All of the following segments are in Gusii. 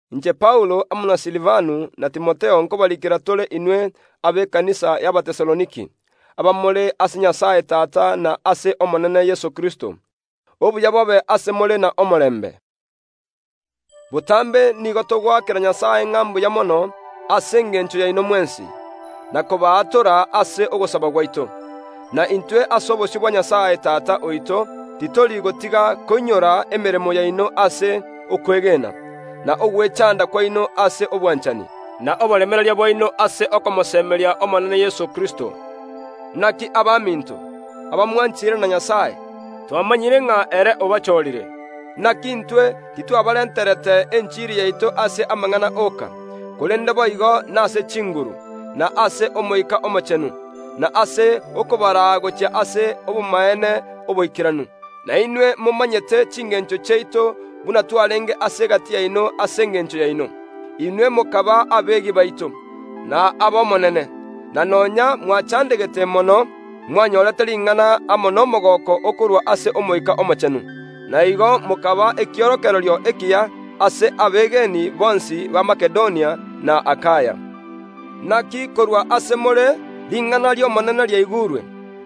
Inche Paulo amo na Silivano na Timotheo nkobariikera tore inwe abekanisa y’Abatesaloniki, abamore ase Nyasae Tata na ase Omonene Yeso Kristo: Obuya bobe ase more na omorembe. Botambe nigo togoakera Nyasae ng’a mbuya mono ase engencho yaino mwensi, na kobaatora ase ogosaba gwaito. Na intwe ase obosio bwa Nyasae Tata oito titori gotiga koinyora emeremo yaino ase okwegena, na ogwechanda kwaino ase obwanchani, na oboremereria bwaino ase okomosemeri ’Omonene Yeso Kristo. Naki abaminto, abamwanchire na Nyasae, twamanyire ng’a ere obachorire. Naki intwe titwabarenterete enchiri yaito ase amang’ana oka, korende boigo nase chinguru, na ase Omoika Omochenu, na ase okobaraa gochia ase obomaene oboikeranu. Na inwe momanyete chingencho chiaito buna twarenge ase egati yaino ase engencho yaino. Inwe mokaba abegi baito, na ab’Omonene, na nonya mwachandegete mono, mwanyorete ring’ana amo nomogooko okorwa ase Omoika Omochenu, na igo mokaba ekiorokererio ekiya ase abegeni bonsi ba Makedonia na Akaya. Naki korwa ase more ring’ana ri’Omonene riaigurwe,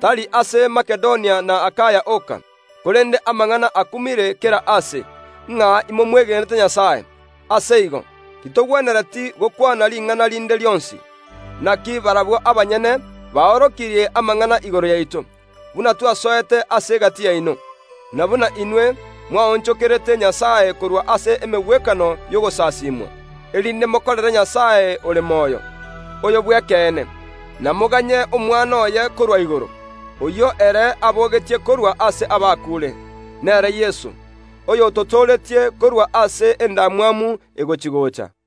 tari ase Makedonia na Akaya oka, korende amang’ana akumire kera aase, ng’a imomwegenete Nyasae. Ase igo titogwenereti gokwana ring’ana rinde rionsi. Naki barabwo abanyene baorokirie amang’ana igoro yaito, buna twasoete ase egati yaino, na buna inwe mwaonchokerete Nyasae korwa ase emegwekano y’ogosasimwa, erinde mokorere Nyasae ore moyo, oyo bw’ekeene, na moganye Omwana oye korwa igoro, oyio ere abogetie korwa ase abakuure, nere Yeso, oyototooretie korwa ase endamwamu egochi‐gocha.